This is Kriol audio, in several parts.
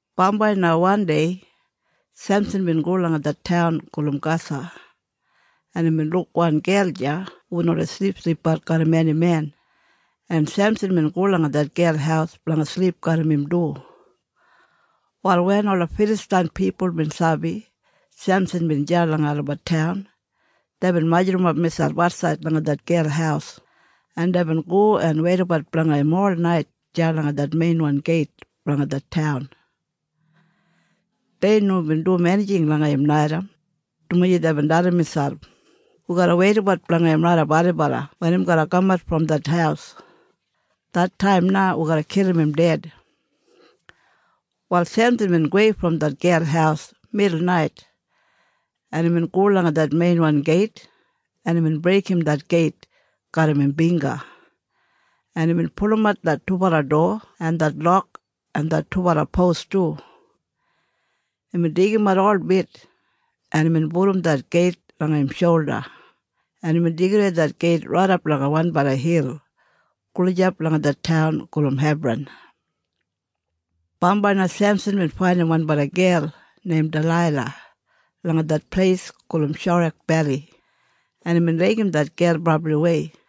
Bambai na wandei Semsan bin go langa det taun gulum Gasa, en imbin luk wan gel deya hubin oldei silipsilipbat garram eni men, en Semsan bin go langa det gel haus blanga silip garram im du. Wal wen ola Filastain pipul bin sabi Semsan bin deya langa olabat taun, deibin majurrumap miselp atsaid langa det gel haus, en deibin go en weidabat blanga im olnait deya langa det meinwan geit blanga det taun. Dei nomo bin dum enijing langa im naitaim, dumaji deibin dalim miselp, “Wi garra weidabat blanga im raidap ailibala wen im garra kamat brom det haus. Det taim na wi garra kilim im ded.” Wal Semsan bin gowei brom det gel haus midulnait, en imbin go langa det meinwan geit, en imbin breigim det geit garram im bingga, en imbin pulumat det dubala dowa en det lok en det dubala pos du. Imbin deigimat holbit, en imbin pudum det geit langa im sholda, en imbin deigidawei det geit raidap langa wanbala hil gulijap langa det taun gulum Hebran. Bambai na Semsan bin faindim wanbala gel neim Dalaila langa det pleis gulum Sorek Beli, en imbin laigim det gel brabliwei,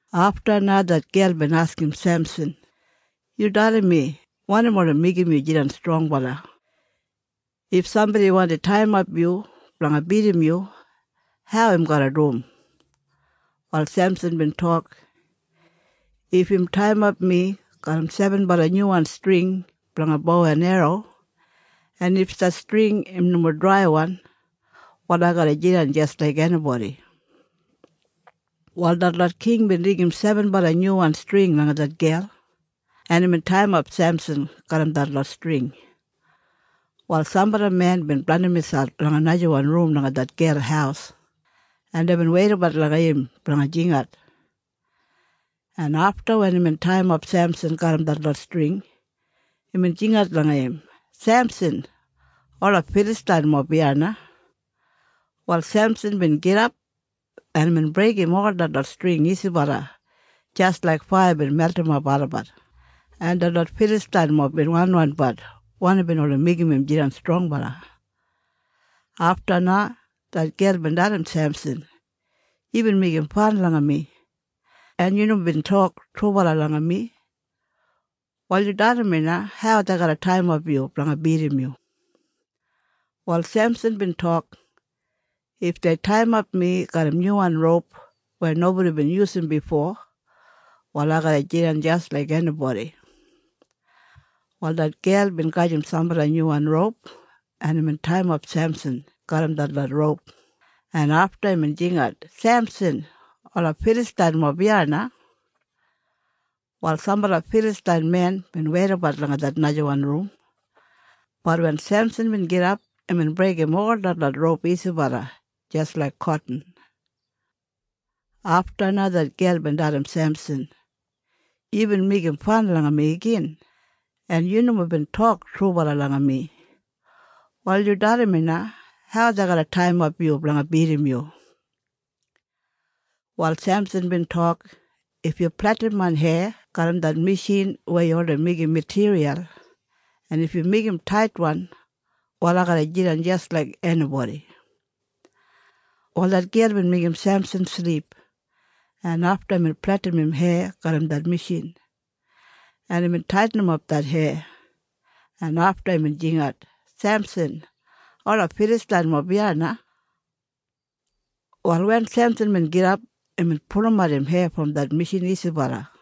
Afta na det gel bin askim Semsan, “Yu dalim mi wanim oldei meigim yu jidan strongbala. If sambodi wandim taiyimap yu blanga bidim yu, hau im garra dum?” Wal Semsan bin tok, “If im taiyimap mi garram sebenbala nyuwan string blanga bo en erro, en if det string im nomo draiwan, wal ai garra jidan jis laik enibodi.” Wal detlot king bin deigim sebenbala nyuwan string langa det gel, en imbin taiyimap Semsan garram detlot string. Wal sambala men bin blandim miselp langa najawan rum langa det gel haus, en deibin weidabat langa im blanga jingat, en afta wen imbin taiyimap Semsan garram detlot string, imbin jingat langa im, “Semsan! Ola Filastainmob iya na!” Wal Semsan bin gidap, en imbin breigim ol detlot string isibala jis laik faiya bin meltimap olabat, en detlot Filastainmob bin wanwanbat wanim bin oldei meigim im jidan strongbala. Afta na det gel bin dalim Semsan, “Yubin meigim fan langa mi, en yu nomo bin tok trubala langa mi. Wal yu dalim mi na hau dei garra taiyimap yu blanga bidim yu.” Wal Semsan bin tok, “If dei taiyimap mi garram nyuwan roup weya nobodi bin yusum bifo, wal ai garra jidan jis laik enibodi.” Wal det gel bin gajim sambala nyuwan roup, en imbin taiyimap Semsan garram detlot roup, en afta imbin jingat, “Semsan! Ola Filastainmob iya na!” Wal sambala Filastain men bin weidabat langa det najawan rum. Bat wen Semsan bin gidap, imbin breigim ol detlot roup isibala jis laik kotin. Afta na det gel bin dalim Semsan, “Yubin meigim fan langa mi igin, en yu nomo bin tok trubala langa mi. Wal yu dalim mi na hau dei garra taiyimap yu blanga bidim yu.” Wal Semsan bin tok, “If yu pletim main heya garram det mishin weya yu oldei meigim matiriyal, en if yu meigim im taitwan, wal ai garra jidan jis laik enibodi.” Wal det gel bin meigim Semsan silip, en afta imbin pletim im heya garram det mishin, en imbin taitinimap det heya, en afta imbin jingat, “Semsan! Ola Filastainmob iya na!” Wal wen Semsan bin gidap, imbin pulumat im heya brom det mishin isibala.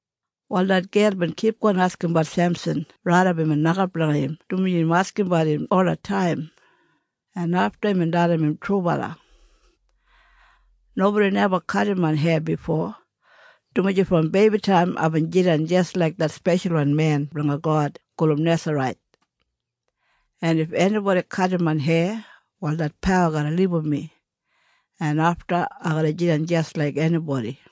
Wal det gel bin kipgon askimbat Semsan raidap imbin nokap langa im dumaji im askimbat im olataim, en afta imbin dalim im trubala, “Nobodi neba kadim main heya bifo, dumaji brom beibitaim aibin jidan jis laik det speshalwan men blanga God gulum Nesarait. En if enibodi kadim main heya, wal det pawa garra libum mi, en afta ai garra jidan jis laik enibodi.”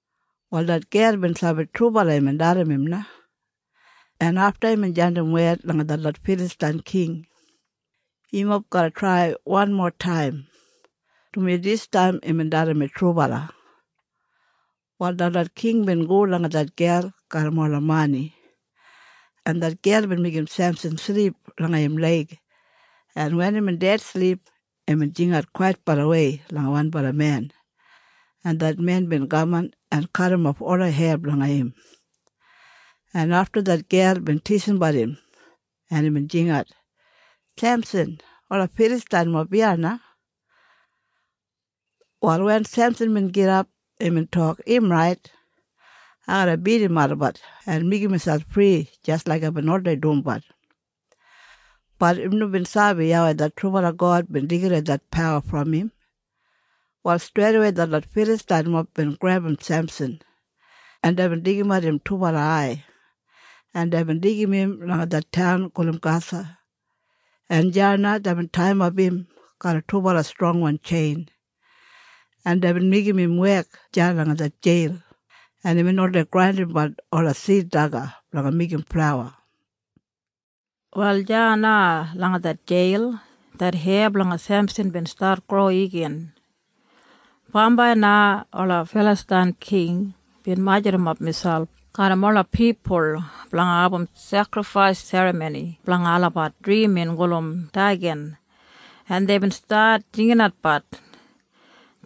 Wal det gel bin sabi trubala imbin dalim im na, en afta imbin jandim wed langa detlot Filastain king, “Yumob garra traim wanmotaim, dumaji distaim imbin dalim mi trubala.” Wal detlot king bin go langa det gel garram ola mani, en det gel bin meigim Semsan silip langa im leig, en wen imbin dedsilip, imbin jingat kwaitbalawei langa wanbala men, en det men bin kaman en kadimof ola heya blanga im, en afta det gel bin tisimbat im, en imbin jingat, “Semsan! Ola Filastainmob iya na!” Wal wen Semsan bin gidap, imbin tok, “Im rait. Ai garra bidim olabat en meigim miselp fri jis laik aibin oldei dumbat.” Bat im nomo bin sabi YAWEI det trubala God bin deigidawei det pawa brom im. Wal streidawei detlot Filastainmob bin grebum Semsan, en deibin deigimat im dubala ai, en deibin deigim im langa det taun gulum Gasa, en deya na deibin taiyimap im garram dubala strongwan tjein, en deibin meigim im wek deya langa det jeil, en imbin oldei grandimbat ola sid daga blanga meigim flauwa. Wal deya na langa det jeil det heya blanga Semsan bin stat gro igin. Bambai na ola Filastain king bin majurrumap miselp garram ola pipul blanga abum sekrifais serramoni blanga olabat drimin gulum Deigan, en deibin stat jinginat,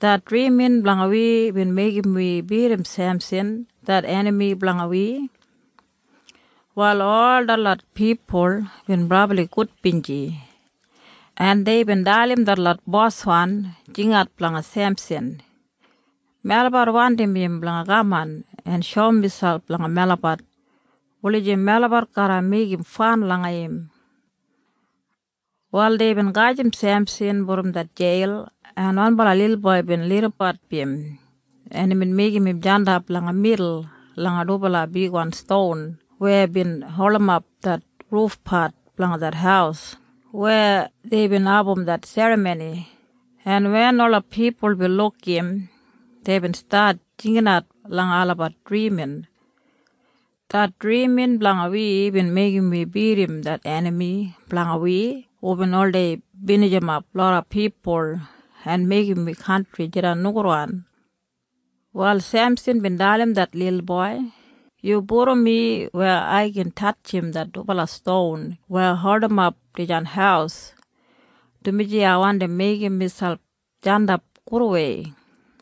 “Det drimin blanga wi bin meigim wi bidim Semsan det enami blanga wi!” Wal ol detlot pipul bin brabli gudbinji, en deibin dalim detlot boswan, “Jingat blanga Semsan! Melabat wandim im blanga kaman en shoum miselp langa melabat wulijim melabat garra meigim fan langa im.” Wal deibin gajim Semsan brom det jeil, en wanbala lilboi bin lidimbat im, en imbin meigim im jandap langa midul langa dubala bigwan ston weya bin holdimap det rufpat blanga det haus weya deibin abum det serramoni, en wen ola pipul bin luk im, deibin stat jinginat langa olabat drimin, “Det drimin blanga wi bin meigim wi bidim det enami blanga wi hubin oldei binijimap loda pipul en meigim wi kantri jidan nogudwan.” Wal Semsan bin dalim det lilboi, “Yu pudum mi weya ai gin tatjim det dubala ston weya holdimap dijan haus, dumaji ai wandim meigim miselp jandap gudwei.”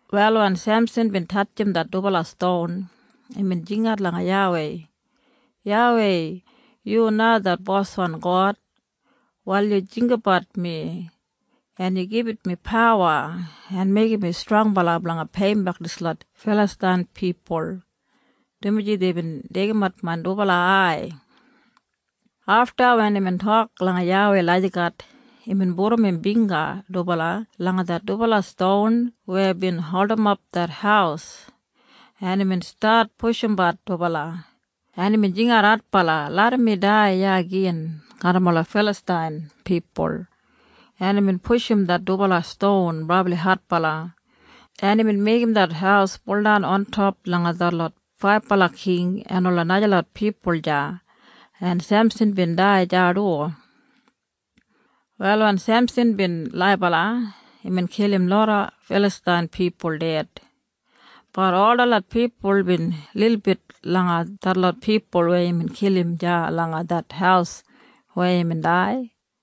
Wal wen Semsan bin tatjim det dubala ston, imbin jingat langa YAWEI, “YAWEI, yu na det boswan God. Wal yu jinggabat mi, en yu gibit mi pawa en meigim mi strongbala blanga peiyimbek dislot Filastain pipul, dumaji deibin deigimat main dubala ai.” Afta wen imbin tok langa YAWEI lagijat, imbin pudum im bingga dubala langa det dubala ston weya bin holdimap det haus, en imbin stat pushumbat dubala, en imbin jingat adbala, “Larram mi dai iya gin garram ola Filastain pipul!” En imbin pushum det dubala ston brabli adbala, en imbin meigim det haus buldan ontop langa detlot faibala king en ola najalot pipul deya, en Semsan bin dai deya du. Wal wen Semsan bin laibala, imbin kilim loda Filastain pipul ded. Bat ol detlot pipul bin lilbit langa detlot pipul weya imbin kilim deya langa det haus weya imbin dai.